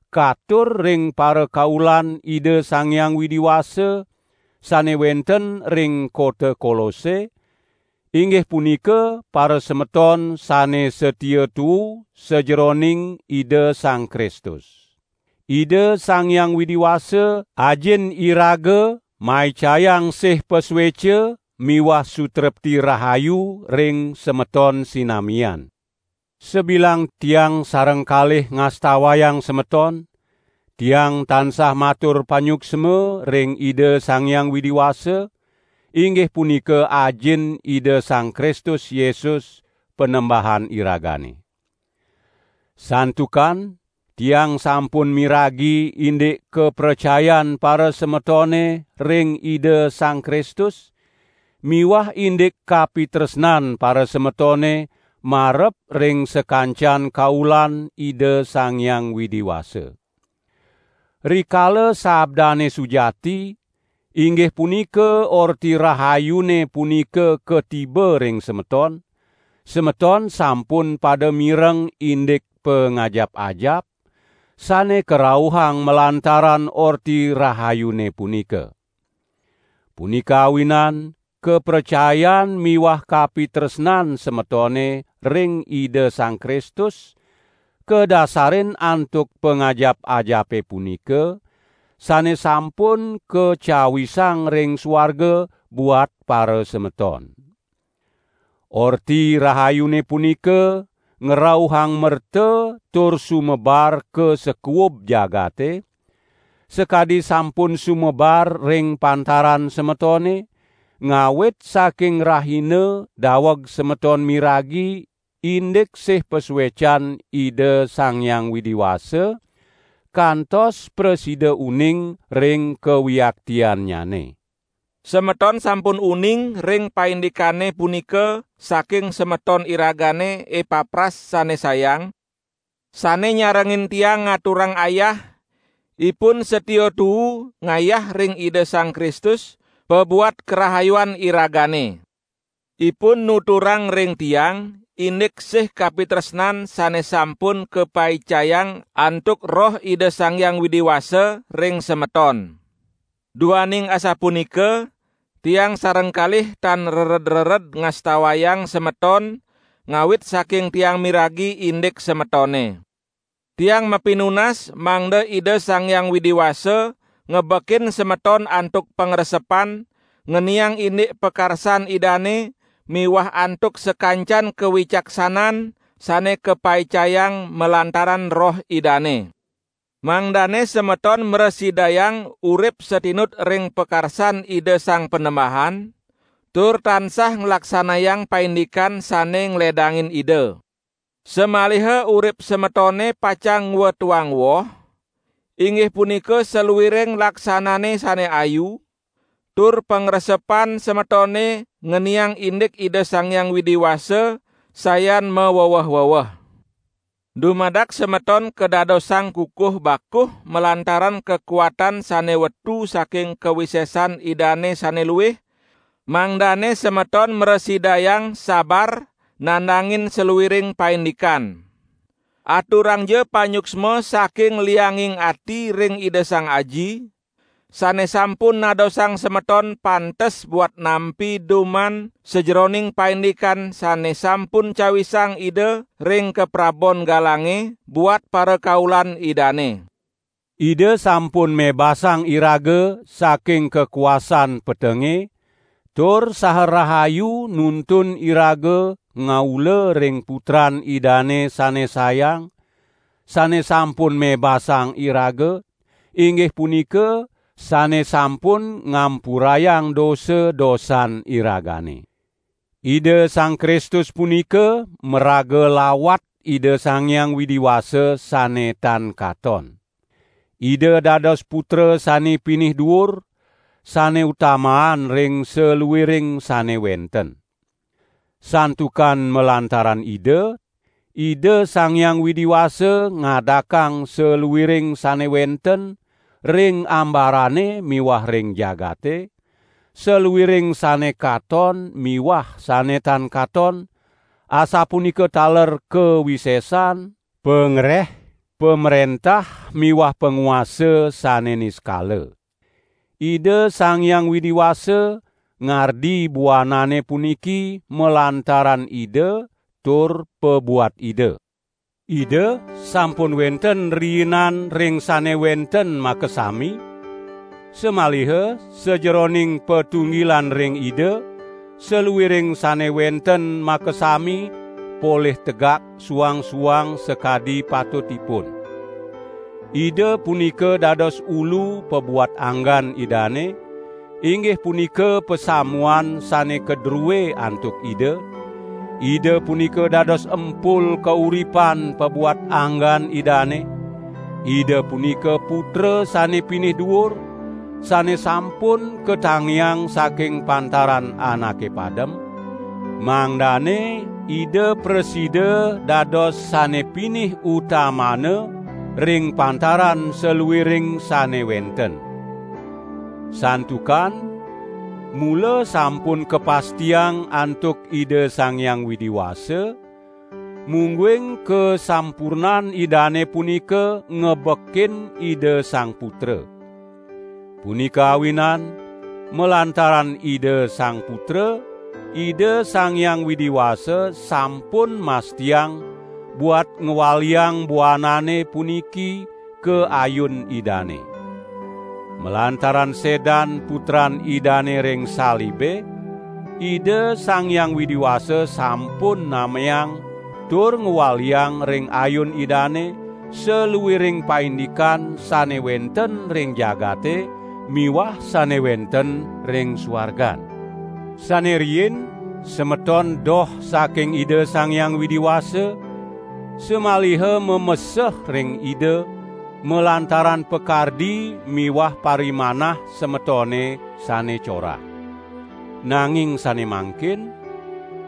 katur ring parakaulan Ida Sang Hyang Widi Wasa, sane wenten ring kota Kolose, inggih punika parasemeton sane satia tuu sajeroning Ida Sang Kristus. Ida Sang Hyang Widi Wasa, Ajin iraga maicayang sih pasueca miwah sutrepti rahayu ring semeton sinamian. Sabilang tiang sareng kalih ngastawayang semeton, tiang tansah matur panyuksma ring Ida Sang Hyang Widi Wasa, inggih punika Ajin Ida Sang Kristus Yesus, Panembahan iragane. Santukan tiang sampun miragi indik kapracayan parasemetone ring Ida Sang Kristus miwah indik kapitresnan parasemetone marep ring sakancan kaulan Ida Sang Hyang Widi Wasa. Rikala sabdane sujati, inggih punika Orti Rahayune punika katiba ring semeton, semeton sampun pada mireng indik pangajap-ajap, sane karauhang malantaran Orti Rahayune punika. Punika awinan kapracayan miwah kapitresnan semetone ring Ida Sang Kristus kadasarin antuk pangajap-ajape punika, sane sampun kacawisang ring suarga buat parasemeton. Orti Rahayune punika ngrauhang merta tur sumebar ka sakuub jagate, sakadi sampun sumebar ring pantaran semetone, ngawit saking rahina daweg semeton miragi indik sih pasuecan Ida Sang Hyang Widi Wasa, kantos prasida uning ring kawiaktiannyane. Semeton sampun uning ring paindikane punika saking semeton iragane Epapras sane sayang, sane nyarengin tiang ngaturang ayah; ipun satia tuu ngayah ring Ida Sang Kristus pabuat karahayuan iragane. Ipun nuturang ring tiang indik sih kapitresnan sane sampun kapaicayang antuk Roh Ida Sang Hyang Widi Wasa ring semeton. Duaning asapunika tiang sareng kalih tan rered-rered ngastawayang semeton ngawit saking tiang miragi indik semetone. Tiang mapinunas mangda Ida Sang Hyang Widi Wasa ngebekin semeton antuk pangresepan ngeniang indik pakarsan Idane miwah antuk sakancan kawicaksanan sane kapaicayang malantaran Roh Idane. Mangdane semeton mrasidayang urip satinut ring pakarsan Ida Sang Panembahan, tur tansah nglaksanayang paindikan sane ngledangin Ida. Samaliha urip semetone pacang ngwetuang woh, inggih punika saluiring laksanane sane ayu, tur pangresepan semetone ngeniang indik Ida Sang Hyang Widi Wasa sayan maweweh-weweh. Dumadak semeton kadadosang kukuh bakuh malantaran kakuatan sane wetu saking kawisesan Idane sane luih, mangdane semeton mrasidayang sabar nandangin saluiring paindikan. Aturangja panyuksma saking lianging ati ring Ida Sang Aji, sane sampun nadosang semeton pantes buat nampi duman sajeroning paindikan sane sampun cawisang Ida ring kaprabon galange buat parakaulan Idane. Ida sampun mebasang iraga saking kakuasan petenge tur saha rahayu nuntun iraga ngaula ring Putran Idane sane sayang, sane sampun mebasang iraga, inggih punika sane sampun ngampurayang dosa-dosan iragane. Ida Sang Kristus punika maraga lawat Ida Sang Hyang Widi Wasa sane tan katon. Ida dados putra sane pinih duur, sane utamaan ring saluiring sane wenten. Santukan malantaran Ida, Ida Sang Hyang Widi Wasa ngadakang saluiring sane wenten ring ambarane miwah ring jagate, saluiring sane katon miwah sane tan katon, asapunika taler kawisesan, pangreh, pamrentah miwah panguasa sane niskala. Ida Sang Hyang Widi Wasa ngardi buanane puniki malantaran Ida tur pabuat Ida. Ida sampun wenten riinan ring sane wenten makasami, samaliha sajeroning patunggilan ring Ida, saluiring sane wenten makasami polih tegak suang-suang sakadi patutipun. Ida punika dados Ulu pabuat anggan Idane, inggih punika pasamuan sane kadrue antuk Ida; Ida punika dados empul kauripan pabuat anggan Idane; Ida punika putra sane pinih duur, sane sampun katangiang saking pantaran anake padem, mangdane Ida prasida dados sane pinih utamana ring pantaran saluiring sane wenten. Santukan mula sampun kapastiang antuk Ida Sang Hyang Widi Wasa, mungguing kasampurnan Idane punika ngebekin Ida Sang Putra. Punika awinan malantaran Ida Sang Putra, Ida Sang Hyang Widi Wasa sampun mastiang buat ngwaliang buanane puniki ka ayun Idane. Malantaran sedan Putran Idane ring salibe, Ida Sang Hyang Widi Wasa sampun nameang tur ngwaliang ring ayun Idane, saluiring paindikan sane wenten ring jagate miwah sane wenten ring suargan. Sane riin semeton doh saking Ida Sang Hyang Widi Wasa, samaliha mameseh ring Ida malantaran pakardi miwah parimanah semetone sane corah. Nanging sane mangkin,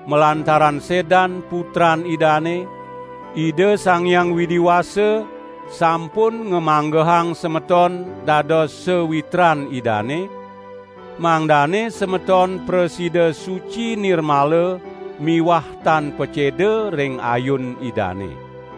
malantaran sedan Putran Idane, Ida Sang Widi Wasa sampun ngamanggehang semeton dados sawitran Idane, mangdane semeton prasida suci nirmala miwah tan paceda ring ayun Idane.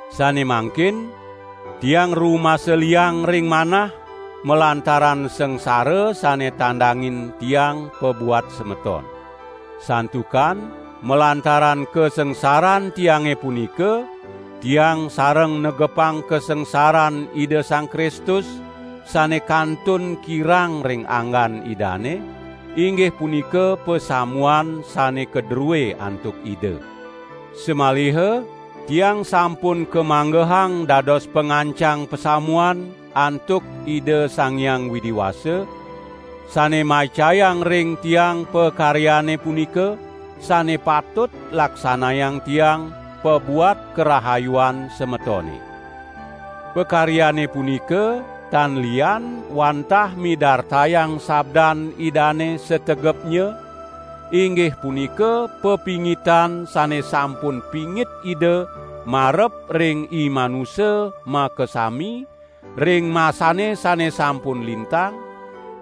Sane mangkin, tiang rumasa liang ring manah malantaran sangsara sane tandangin tiang pabuat semeton. Santukan malantaran kasangsaran tiange punika, tiang sareng negepang kasangsaran Ida Sang Kristus sane kantun kirang ring anggan Idane, inggih punika pasamuan sane kadrue antuk Ida. Samaliha tiang sampun kamanggehang dados pangancang pasamuan antuk Ida Sang Hyang Widi Wasa, sane maicayang ring tiang pakaryane punika, sane patut laksanayang tiang pabuat karahayuan semetone. Pakaryane punika tan lian wantah midartayang sabdan Idane sategepnya, inggih punika pepingitan sane sampun pingit Ida marep ring imanusa makasami ring masane sane sampun lintang,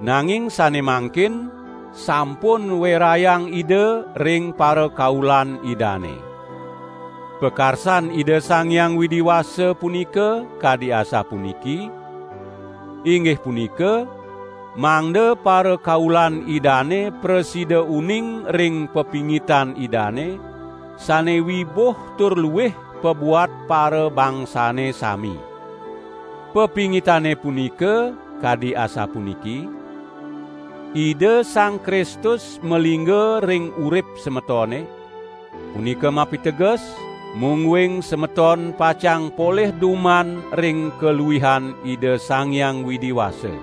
nanging sane mangkin sampun werayang Ida ring parakaulan Idane. Pakarsan Ida Sang Hyang Widi Wasa punika kadi asapuniki: inggih punika, mangda parakaulan Idane prasida uning ring pepingitan Idane, sane wibuh tur luih pabuat parabangsane sami. Pepingitane punika, kadi asapuniki: Ida Sang Kristus malingga ring urip semetone, punika mapiteges, mungguing semeton pacang polih duman ring kaluihan Ida Sang Hyang Widi Wasa.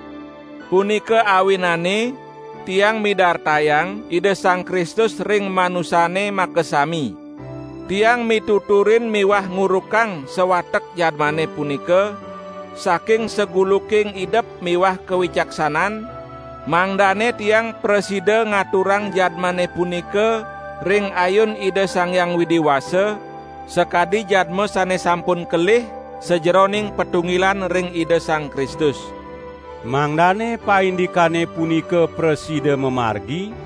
Punika awinane tiang midartayang Ida Sang Kristus ring manusane makasami. Tiang mituturin miwah ngurukang sawatek jadmane punika saking saguluking idep miwah kawicaksanan, mangdane tiang prasida ngaturang jadmane punika ring ayun Ida Sang Hyang Widi Wasa, sakadi jadma sane sampun kelih sajeroning patunggilan ring Ida Sang Kristus. Mangdane paindikane punika prasida mamargi,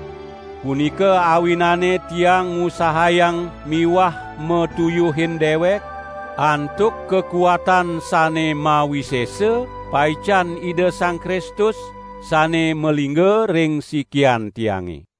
punika awinane tiang ngusahayang miwah matuyuhin dewek, antuk kakuatan sane mawisesa paican Ida Sang Kristus sane malingga ring sikian tiange.